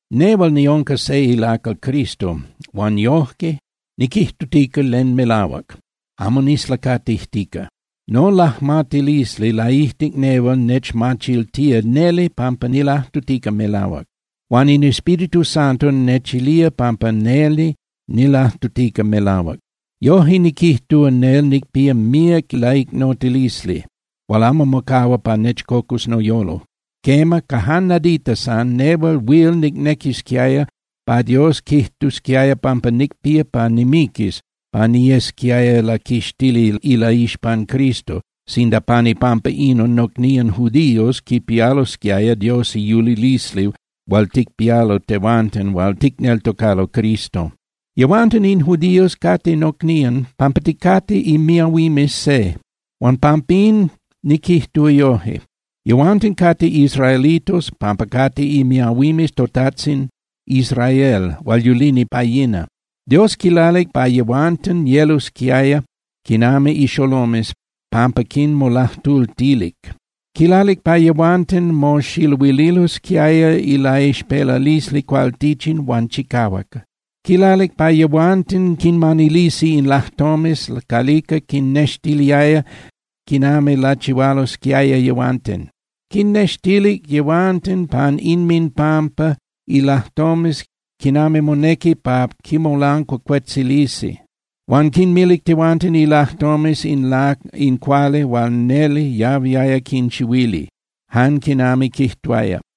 Nehual niunca se ilacal Cristo huan yoje niquijtutica len melahuac, amo nislacatijtica. Nolajmatilisli laijtic nehual nechmachiltía neli pampa nilajtutica melahuac. Huan in Espíritu Santo nechilía pampa neli nilajtutica melahuac. Yoje niquijtúa nel nicpía míac laicnotilisli hual amo mocahua pa nechcocus noyolo. Quema, ca jan nadita san, nehual huil nicnequisquiaya pa Dios quijtusquiaya pampa nicpía pa nimiquis pa niyesquiaya laquixtili ilaixpan Cristo sinda pan ipampa inon nocnían judíos quipialosquiaya Dios iyulilisli hual ticpialo tehuanten hual ticneltocalo Cristo. Yehuanten in judíos cate nocnían pampa ticate imiahuimes se, huan pampín niquijtúa yoje. Yehuanten cate israelitos pampa cate imiahuimes totajtzin Israel hual yulini pa yina. Dios quilalic pa yehuanten yelosquiaya quinami ixolomes pampa quinmolajtultilic. Quilalic pa yehuanten moxiluililosquiaya ilaixpelalisli cualtichin huan chicahuac. Quilalic pa yehuanten quinmanilisi in lajtomes calica quinnextiliaya quinami lachihualosquiaya yehuanten. Quinnextilic yehuanten pan inminpampa ilajtomes quinami monequi pa quimolancuacuetzilisi. Huan quinmilic yehuanten ilajtomes in cuali hual neli yahuiaya quinchihuili, jan quinami quijtuaya.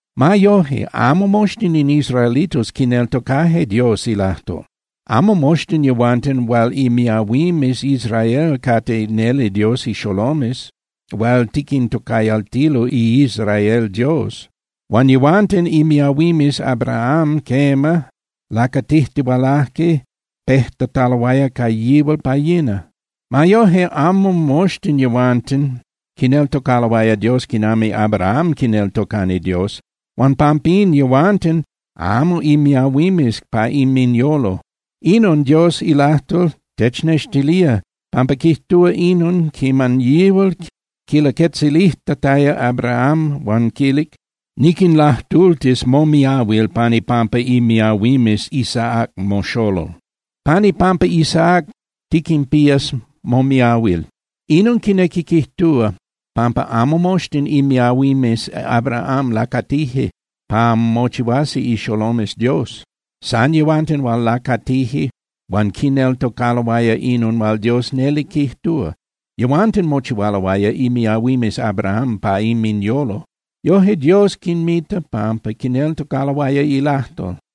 Ma yoje, amo moxtin in israelitos quineltocaje Dios ilajtol. Amo moxtin yehuanten hual imiahuimes Israel cate neli Dios ixolomes hual tiquintocayaltilo iIsrael Dios. Huan yehuanten imiahuimes Abraham, quema, lacatijtihualaje pejtataloaya ca yihual pa yina. Ma yoje, amo moxtin yehuanten quineltocaloaya Dios quinami Abraham quineltocani Dios. Huan pampín yehuanten amo imiahuimes pa inminyolo. Inon Dios ilajtol technextilía pampa quijtúa inon quiman yihual quilaquetzilijtataya Abraham huan quilic: “Niquinlajtultis momiahuil pan ipampa imiahuimes Isaac moxolol. Pan ipampa Isaac tiquinpías momiahuil.” Inon quinequi quijtúa pampa amo moxtin imiahuimes Abraham lacatije pa mochihuasi ixolomes Dios. San yehuanten hual lacatije huan quineltocaloaya inon hual Dios neli quijtúa, yehuanten mochihualoaya imiahuimes Abraham pa inminyolo. Yoje Dios quinmita, pampa quineltocaloaya ilajtol.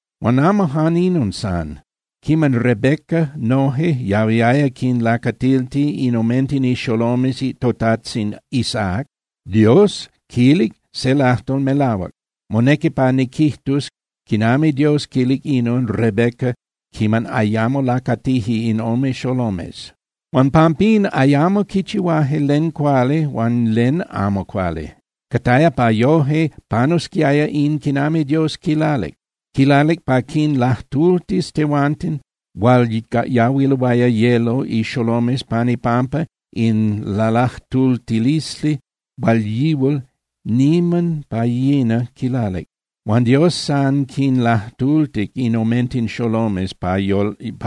Huan amo jan inon san. Quiman Rebeca noje yahuiaya quinlacatilti in omenten ixolomes totajtzin Isaac, Dios quilic se lajtol melahuac. Monequi pa niquijtus quinami Dios quilic inon Rebeca quiman ayamo lacatije in ome xolomes, huan pampín ayamo quichihuaje len cuali huan len amo cuali. Cataya pa yoje panusquiaya in quinami Dios quilalic. Quilalic pa quinlajtultis yehuanten hual yahuiloaya yelo ixolomes pan ipampa in lalajtultilisli hual yihual niman pa yina quilalic. Huan Dios san quinlajtultic in omenten xolomes pa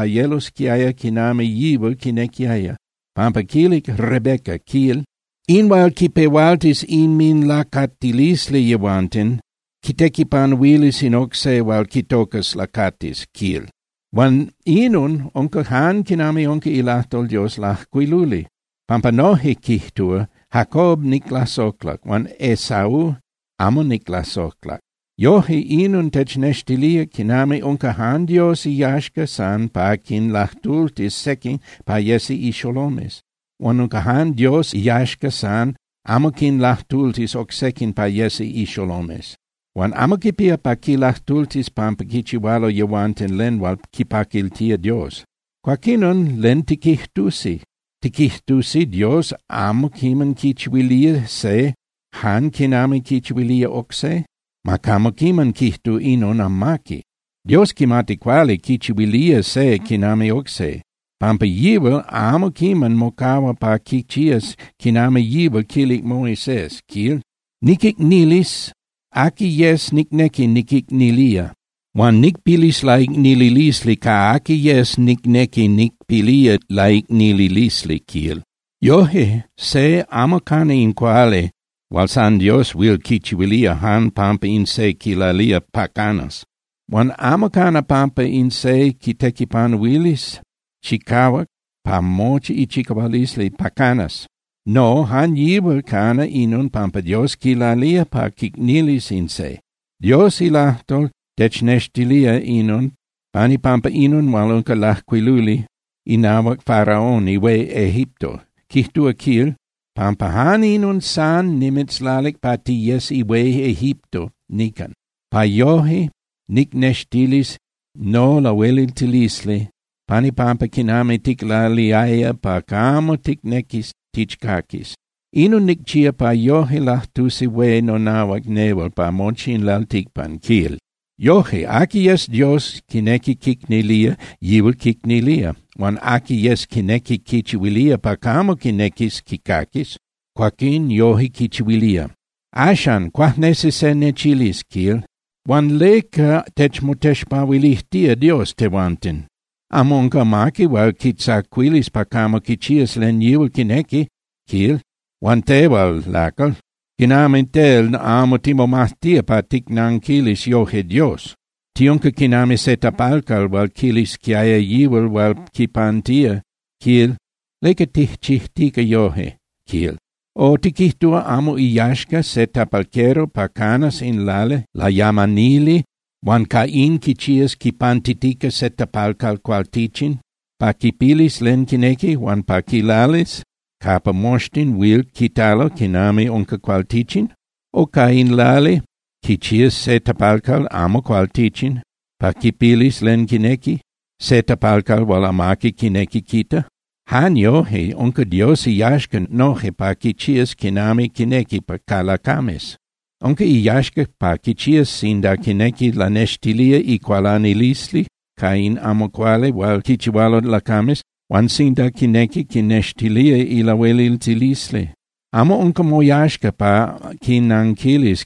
yelosquiaya quinami yihual quinequiaya, pampa quilic Rebeca, quil: “In hual quipehualtis inminlacatilisli yehuanten quitequipanuilis in oc se hual quitocas lacatis”, quil. Huan inon unca jan quinami unca ilajtol Dios lajcuiluli, pampa noje quijtúa: “Jacob niclasojlac huan Esaú amo niclasojlac.” Yoje inon technextilía quinami unca jan Dios iyaxca san pa quinlajtultis sequin pa yesi ixolomes, huan unca jan Dios iyaxca san amo quinlajtultis oc sequin pa yesi ixolomes. Huan amo quipía pa quinlajtultis pampa quichihualo yehuanten len hual quipaquiltía Dios. Cuaquinon, ¿len tiquijtusi? ¿Tiquijtusi Dios amo quimati quichihuilía se jan quinami quichihuilía oc se? ¡Ma camo quiman quijtu inon amaqui! Dios quimati cuali quichihuilía se quinami oc se, pampa yihual amo quiman mocahua pa quichías quinami yihual quilic Moisés, quil: “Niquicnilis aqui yes nicnequi niquicnilía, huan nicpilis laicnililisli ca aqui yes nicnequi nicpilía laicnililisli”, quil. Yoje, se amo cana in cuali hual san Dios huil quichihuilía jan pampa in se quilalía pa canas. Huan amo cana pampa in se quitequipanuilis chicahuac ca mochi ichicahualisli pa canas. No, jan yihual cana inon pampa Dios quilalía pa quicnilis in se. Dios ilajtol technextilía inon pan ipampa inon hual unca lajcuiluli inahuac Faraón ihué Egipto. Quijtúa, quil: “Pampa jan inon san nimitzlalic pa tiyes ihué Egipto nican, pa yoje nicnextilis nolahueliltilisli pan ipampa quinami ticlaliaya pa camo ticnequis tichcaquis. Inon nicchía pa yoje lajtusi hué nonahuac nehual pa mochi in lalticpan”, quil. Yoje, aqui yes Dios quinequi quicnilía, yihual quicnilía. Huan aqui yes quinequi quichihuilía pa camo quinequis quicaquis, cuaquín yoje quichihuilía. Axan, cuajnesi se nechilis, quil: “Huan ¿leca techmotexpahuilijtía Dios tehuanten? Amo unca amaqui huil quitzacuilis pa camo quichías len yihual quinequi”, quil. ¡Huan tehual, lacal! ¿Quinami tel amo timomajtía pa ticnanquilis yoje Dios? Tiunca quinami se tapalcal hual quilisquiaya yihual hual quipantía, quil: “¿Leca tijchijtica yoje?”, quil. O ¿tiquijtúa amo iyaxca se tapalquero pa canas in lali layamanili huan ca in quichías quipantitica se tapalcal cualtichin pa quipilis len quinequi huan pa quilalis capa moxtin huil quitalo quinami unca cualtichin? O ¿ca in lali quichías se tapalcal amo cualtichin pa quipilis len quinequi, se tapalcal hual amaqui quinequi quita? Jan yoje, unca Dios iyaxca noje pa quichías quinami quinequi ca lacames. Unca iyaxca pa quichías sinda quinequi lanextilía icualanilisli ca in amo cuali hual quichihualo lacames huan sinda quinequi quinnextilía ilahueliltilisli. Amo unca moyaxca pa quinanquilis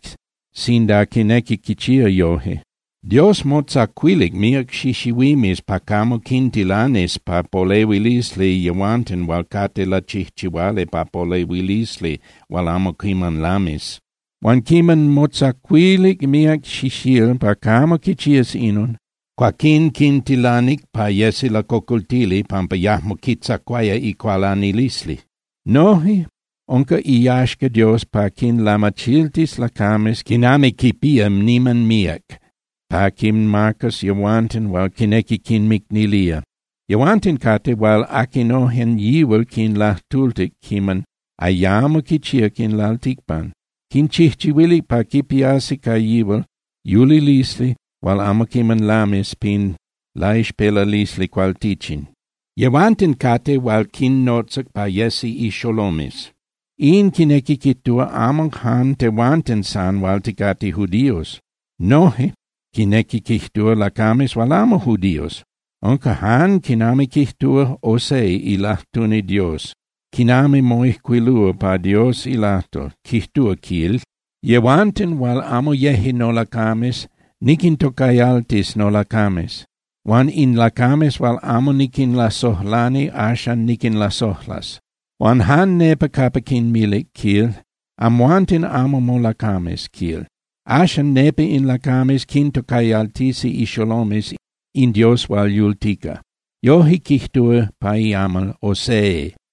sinda quinequi quichía yoje. Dios motzacuilic míac xixihuimes pa camo quintilanis pa polehuilisli yehuanten hual cate lachijchihuali pa polehuilisli hual amo quiman lamis. Huan quiman motzacuilic míac xixíl pa camo quichías inon, cuaquín quintilanic pa yesi lacocoltili pampa yajmo quitzacuaya icualanilisli. Noje unca iyaxca Dios pa quinlamachiltis lacames quinami quipía niman míac pa quinmacas yehuanten hual quinequi quinmicnilía. Yehuanten cate hual aquinojen yihual quinlajtultic quiman ayamo quichíac in lalticpan. Quinchijchihuilic pa quipiasi ca yihual yulilisli hual amo quiman lamis pin laixpelalisli cualtichin. Yehuanten cate hual quinnotzac pa yesi ixolomes, in quinequi quijtúa amo jan tehuanten san hual ticate judíos. Noje quinequi quijtúa lacames hual amo judíos. Unca jan quinami quijtúa Osee ilajtuni Dios, quinami moijcuilúa pa Dios ilajtol, quijtúa, quil: Yehuanten hual amo yeje nolacames niquintocayaltis nolacames, huan in lacames hual amo niquinlasojlani, axan niquinlasojlas. Huan jan nepa capa quinmilic, quil: “Amhuanten amo nolacames”, quil, axan nepa in lacames quintocayaltisi ixolomes in Dios hual yultica. Yoje quijtúa pa iamal Osee.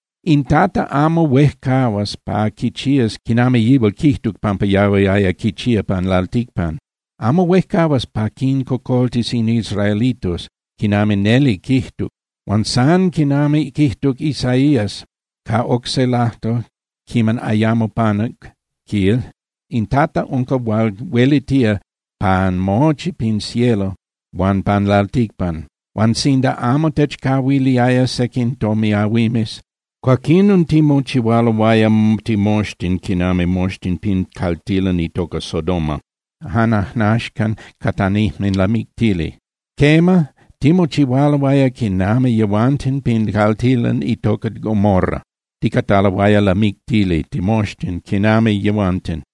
In Tata amo huejcahuas pa quichías quinami yihual quijtuc pampa yahuiaya quichía pan lalticpan. Amo huejcahuas pa quincocoltis in israelitos, quinami neli quijtuc.” Huan san quinami quijtuc Isaías ca oc se lajtol quiman ayamo panuc, quil: In Tata unca hual huelitía pan mochi pin cielo huan pan lalticpan, huan sinda amo techcahuiliaya sequin tomiahuimes, cuaquinon timochihualoaya timoxtin quinami moxtin pin caltilan itoca Sodoma, jan ajnaxcan catanijme lamictili. Quema, timochihualoaya quinami yehuanten pin caltilan itoca Gomorra, ticataloaya lamictili timoxtin quinami yehuanten.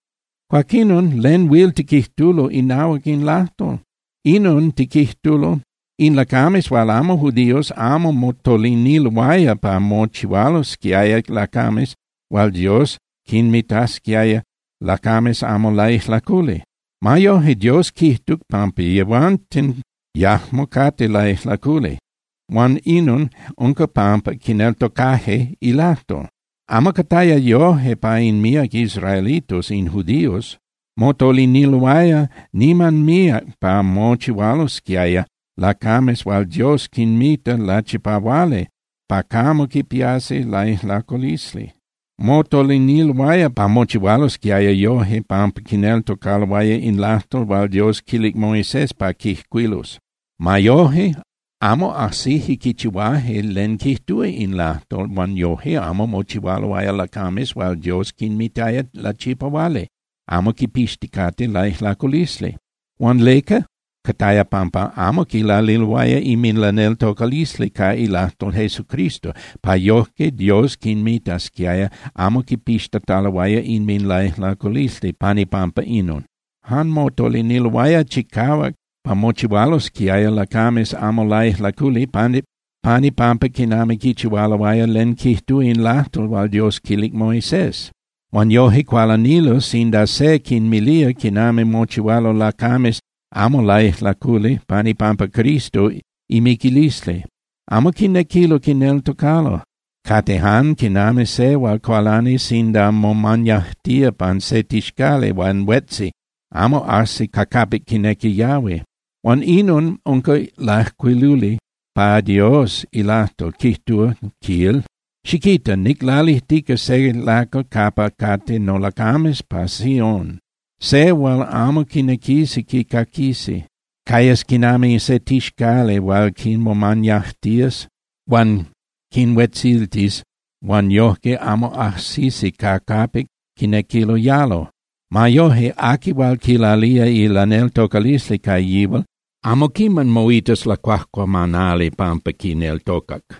Cuaquinon, ¿len huil tiquijtulo inahuac in lajtol? Inon tiquijtulo: In lacames hual amo judíos amo motoliniloaya pa mochihualosquiaya lacames hual Dios quinmitasquiaya lacames amo laijlaculi. Ma yoje Dios quijtuc pampa yehuanten yajmo cate laijlaculi, huan inon unca pampa quineltocaje ilajtol. Amo cataya yoje ca in míac israelitos, in judíos. Motoliniloaya niman míac pa mochihualsquiaya lacames hual Dios quinmita lachipahuali pa camo quipiasi laijlaculisli. Motoliniloaya pa mochihualosquiayao yoje pampa quineltocaloaya in lajtol hual Dios quilic Moisés pa quijcuilus. Ma yoje, amo ajsije quichihuaje len quijtúa in lajtol, huan yoje amo mochihualoaya lacames hual Dios quinmitaya lachipahuali, amo quipixticate laijlaculisli. Huan ¿leca? Cataya pampa amo quilaliloaya inminlaneltocalisli ca ilajtol Jesucristo pa yojque Dios quinmitasquiaya amo quipixtataloaya inminlaijlaculisli pan ipampa inon. Jan motoliniloaya chicahuac pa mochihualosquiaya lacames amo laijlaculi pan ipampa quinami quichihualoaya len quijtúa in lajtol hual Dios quilic Moisés. Huan yoje cualanilo sinda se quinmilía quinami mochihualo lacames amo laijlaculi pan ipampa Cristo imiquilisli. Amo quinequilo quineltocalo, cate jan quinami se hual cualani sinda momañajtía pan se tixcali huan huetzi, amo ajsi ca capic quinequi yahui. Huan inon unca lajcuiluli pa Dios ilajtol, quijtúa, quil: Xiquita, niclalijtica se lacal capa cate nolacames pa Sión, se hual amo quinequisi quicaquisi. Cayas quinami se tixcali hual quinmomañajtías huan quinhuetziltis huan yojque amo ajsisi ca capic quinequilo yalo. Ma yoje, aqui hual quilalía ilaneltocalisli ca yihual amo quiman moitas lacuajcuamanali pampa quineltocac.